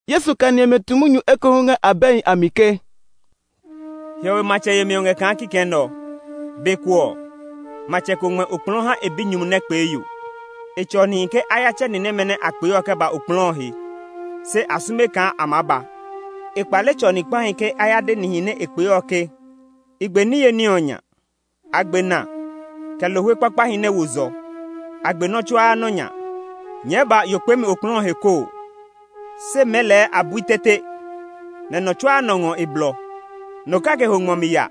Yesu kɛ ni ɔmɛ tu munyu ekohu ngɛ abɛhi a mi ke, “Hiɔwe matsɛ yemi ɔ ngɛ kaa kikɛ nɛ ɔ. Be ko ɔ, matsɛ ko ngmɛ okplɔɔ ha e binyumu nɛ kpee yo. E tsɔ nihi ke a ya tsɛ ni nɛmɛ nɛ a kpee ɔ kɛ ba okplɔɔ ɔ he, se a sume kaa a maa ba. E kpale tsɔ ni kpahi ke a ya de nihi nɛ a kpee ɔ ke, ‘I gbe niye ní ɔ nya. A gbe na, kɛ lohwe kpakpahi nɛ wo zɔ; a gbe nɔ́ tsuaa nɔ́ nya. Nyɛɛ ba yo kpeemi okplɔɔ ɔ he koo!’ Se mɛɛ lɛɛ a bui tete, nɛ nɔ tsuaa nɔ ngɔ e blɔ; nɔ kake ho ngmɔ mi ya,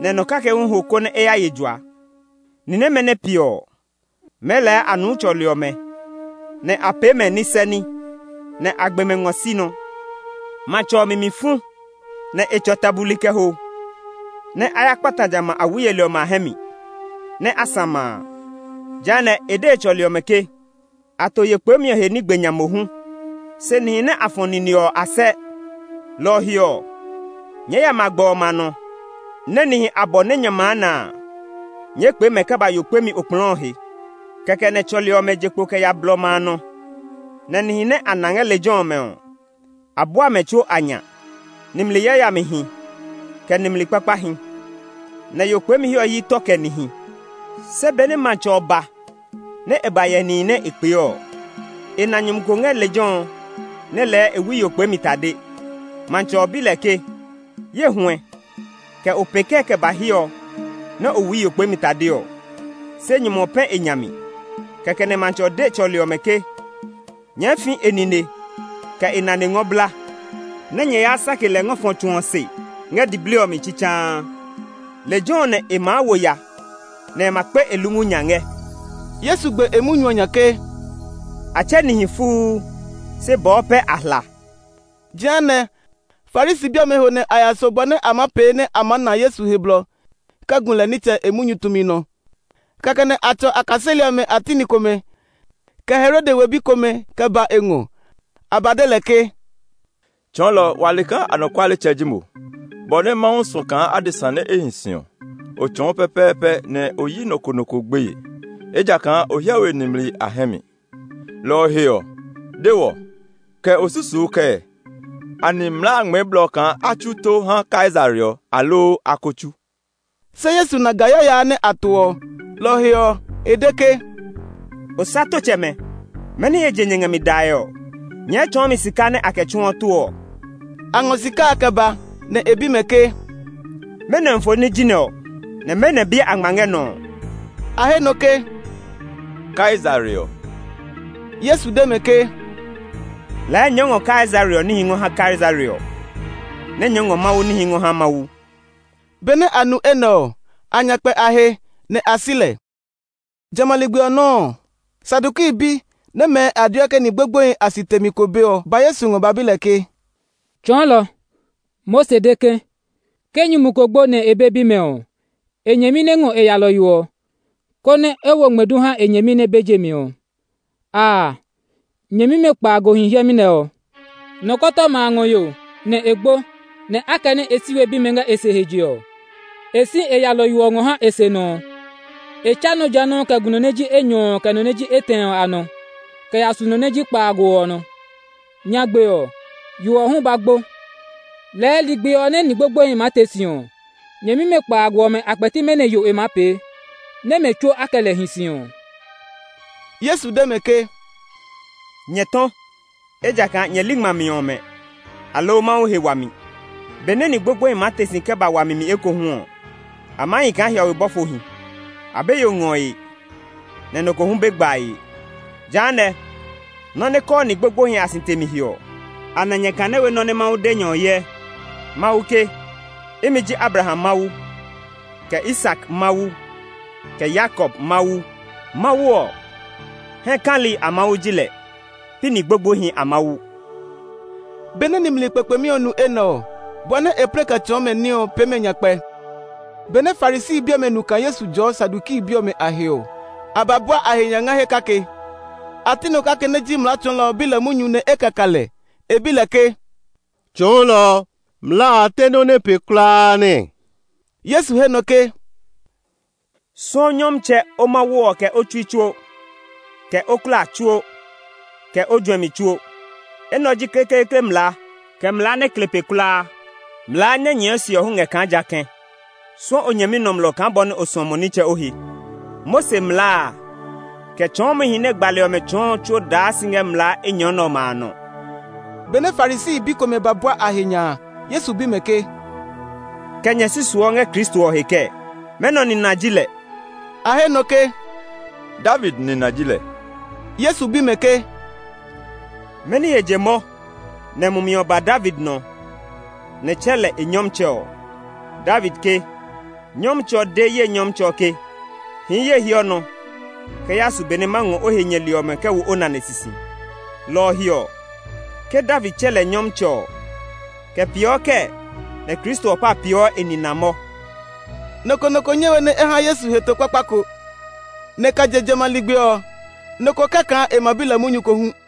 nɛ nɔ kake hu ho konɛ e ya ye jua. Ni nɛmɛ nɛ piɛ ɔ, mɛɛ lɛɛ a nuu tsɔli ɔmɛ, nɛ a pee mɛ nisɛ ní, nɛ a gbe mɛ ngɔ si nɔ. Matsɛ ɔ mi mi fu, nɛ e tsɔ ta buli kɛ ho, nɛ a ya kpata jamɛ a awi yeli ɔmɛ a hɛ mi, nɛ a sã ma a. “Jehanɛ, e de e tsɔli ɔmɛ ke, ‘A to yo kpeemi ɔ he ní gbe nya mohu, se nihi nɛ a fɔ̃ nine ɔ, a sɛ. Lɔ ɔ he ɔ, nyɛɛ ya magbɛ ɔmɛ a nɔ, nɛ nihi abɔ nɛ nyɛ maa na a, nyɛɛ kpee mɛ kɛ ba yo kpeemi okplɔɔ ɔ he.’ Kɛkɛ nɛ tsɔli ɔmɛ je kpo kɛ ya blɔ ɔmɛ a nɔ, nɛ nihi nɛ a na ngɛ lejɛ ɔmɛ ɔ, a bua mɛ tsuo a nya, nimli yayamihi, kɛ nimli kpakpahi. Nɛ yo kpeemi he ɔ hyi tɔ kɛ nihi. “Se benɛ matsɛ ɔ ba nɛ e ba hyɛ nihi nɛ a kpee ɔ, e na nyumu ko ngɛ lejɛ ɔ nɛ lɛɛ e wui yo kpeemi tade. Matsɛ ɔ bi lɛ ke, ‘Ye huɛ, kɛ o pee kɛɛ kɛ ba hiɛ ɔ nɛ o wui yo kpeemi tade ɔ?’ Se nyumu ɔ pɛ̃ e nya mi. Kɛkɛ nɛ matsɛ ɔ de e tsɔli ɔmɛ ke, ‘Nyɛɛ fi e nine, kɛ e nane ngɔ bla, nɛ nyɛ ya sake lɛ ngɔ fɔ tsu ɔ se ngɛ diblii ɔ mi tsitsaa. Lejɛ ɔ nɛ e maa wo ya, nɛ e ma kpe e lungu nya ngɛ.’” Yesu gbe e munyu ɔ nya ke, “A tsɛ nihi fuu, se bɔɔ pɛ a hla.” Jehanɛ, Farisi bi ɔmɛ ho nɛ a ya so, bɔ nɛ a maa pee nɛ a ma na Yesu he blɔ kɛ gu lɛ nitsɛ e munyu tumi nɔ. Kɛkɛ nɛ a tsɔ a kaseli ɔmɛ a ti ni komɛ, kɛ Herode we bi komɛ kɛ ba e ngɔ. A ba de lɛ ke, “Tsɔɔlɔ, wa le kaa anɔkualetsɛ ji mo. Bɔ nɛ Mawu suɔ kaa adesa nɛ hi si ɔ, o tsɔɔ pɛpɛɛpɛ nɛ o yi nɔ ko nɔ ko gbeye; ejakaa o hyɛ we nimli a hɛ mi. Lɔ ɔ he ɔ, de wɔ; kɛ o susuu kɛɛ? Anɛ mlaa ngmɛɛ blɔ kaa a tsu tó ha Kaisare ɔ, aloo a ko tsu?” Se Yesu na ga yaya a nɛ a to ɔ. Lɔ ɔ he ɔ, e de ke, “Osatotsɛmɛ, mɛni he je nyɛ ngɛ mi dae ɔ? Nyɛɛ tsɔɔ mi sika nɛ a kɛ tsuɔ tó ɔ.” A ngɔ sika a kɛ ba; nɛ e bi mɛ ke, “Mɛnɔ ofoni ji nɛ ɔ, nɛ mɛnɔ biɛ a ngma ngɛ nɔ ɔ?” A he nɔ ke, “Kaisare ɔ.” Yesu de mɛ ke, “Lɛɛ nyɛɛ ngɔ Kaisare ɔ níhi ngɔ ha Kaisare ɔ, nɛ nyɛɛ ngɔ Mawu níhi ngɔ ha Mawu.” Benɛ a nu enɛ ɔ, a nya kpɛ a he, nɛ a si lɛ. Jamɛ a ligbi ɔ nɔuu ɔ, Saduki bi, nɛ mɛɛ a deɔ ke ni gbogboehi a si temi ko be ɔ ba Yesu ngɔ ba bi lɛ ke, “Tsɔɔlɔ, Mose de ke, ke nyumu ko gbo, nɛ e be bimɛ ɔ, e nyɛmi nɛ ngɔ e yalɔyo ɔ, konɛ e wo ngmɛdu ha e nyɛmi nɛ be je mi ɔ. Aa, nyɛmimɛ kpaago hi hiɛmɛ nɛ ɔ. Nɔkɔtɔma a ngɔ yo, nɛ e gbo; nɛ akɛnɛ e si we bimɛ ngɛ e se he je ɔ, e si e yalɔyo ɔ ngɔ ha e senɔ ɔ. E tsa nɔ ja nɔuu kɛ gu nɔ nɛ ji enyɔ ɔ kɛ nɔ nɛ ji etɛ ɔ a nɔ, kɛ ya su nɔ nɛ ji kpaago ɔ nɔ. Nyagbe ɔ, yo ɔ hu ba gbo. Lɛɛ ligbi ɔ nɛ ni gbogboehi maa te si ɔ, nyɛmimɛ kpaago ɔmɛ a kpɛti mɛnɔ yo e maa pee, nɛ́ mɛ tsuo a kɛ lɛ hi si ɔ?” Yesu de mɛ ke, “Nyɛ tɔ! Ejakaa nyɛ li ngmami ɔmɛ, aloo Mawu he wami. Benɛ ni gbogboehi maa te si kɛ ba wami mi ekohu ɔ, a maa hi kaa hiɔwe bɔfohi; a be yo ngɔe, nɛ nɔ ko hu be gbae. Jehanɛ, nɔ́ nɛ kɔɔ ni gbogboehi a si temi he ɔ, anɛ nyɛ kane we nɔ́ nɛ Mawu de nyɛ ɔ hyɛ? Mawu ke, ‘Imi ji Abraham Mawu, kɛ Isak Mawu, kɛ Yakob Mawu.’ Mawu ɔ, hɛ kali a Mawu ji lɛ, pi ni gbogboehi a Mawu.” Benɛ nimli kpekpemi ɔ nu enɛ ɔ, bɔ nɛ e plɛ kɛ tsɔɔ mɛ ní ɔ pee mɛ nyakpɛ. Benɛ Farisi bi ɔmɛ nu kaa Yesu jɔɔ Saduki bi ɔmɛ a he ɔ, a ba bua a he nya ngɛ he kake. A ti nɔ kake nɛ ji mlaa tsɔɔlɔ ɔ bi lɛ munyu nɛ e kɛ ka lɛ. E bi lɛ ke, “Tsɔɔlɔ, mlaa a te nɔ́ nɛ pe kulaa nɛɛ?” Yesu he nɔ ke, “ ‘Suɔ Nyɔmtsɛ, o Mawu ɔ kɛ o tsui tsuo, kɛ o klaa tsuo, kɛ o juɛmi tsuo.’ Enɛ ɔ ji kekleekle mlaa, kɛ mlaa nɛ kle pe kulaa. Mlaa nɛ nyɛɛ se ɔ hu ngɛ kaa jã kɛ̃: ‘Suɔ o nyɛmi nɔmlɔ kaa bɔ nɛ o suɔ mo nitsɛ o he.’ Mose mlaa a, kɛ tsɔɔmihi nɛ gbali ɔmɛ tsɔɔ ɔ tsuo daa si ngɛ mlaa enyɔ nɛ ɔmɛ a nɔ.” Benɛ Farisi bi komɛ ba bua a he nya a, Yesu bi mɛ ke, “Kɛ nyɛ susuɔ ngɛ Kristo ɔ he kɛɛ? Mɛnɔ nina ji lɛ?” A he nɔ ke, “David nina ji lɛ.” Yesu bi mɛ ke, “Mɛni he je mɔ nɛ mumi ɔ ba David nɔ, nɛ e tsɛ lɛ ‘Nyɔmtsɛ’ ɔ? David ke, ‘Nyɔmtsɛ ɔ de ye Nyɔmtsɛ ɔ ke, “Hii ye hiɔ nɔ kɛ yaa su be nɛ ma ngɔ o he nyɛli ɔmɛ kɛ wo o nane sisi.” ’ Lɔ ɔ he ɔ, ke David tsɛ lɛ ‘Nyɔmtsɛ’ ɔ, kɛ peeɔ kɛɛ nɛ Kristo ɔ pa peeɔ e nina mɔ?” Nɔ ko nɔ ko nyɛ we nɛ e ha Yesu heto kpakpa ko. Nɛ kɛ je jamɛ a ligbi ɔ, nɔ ko kɛ́ kaa e ma bi lɛ munyu ko hu.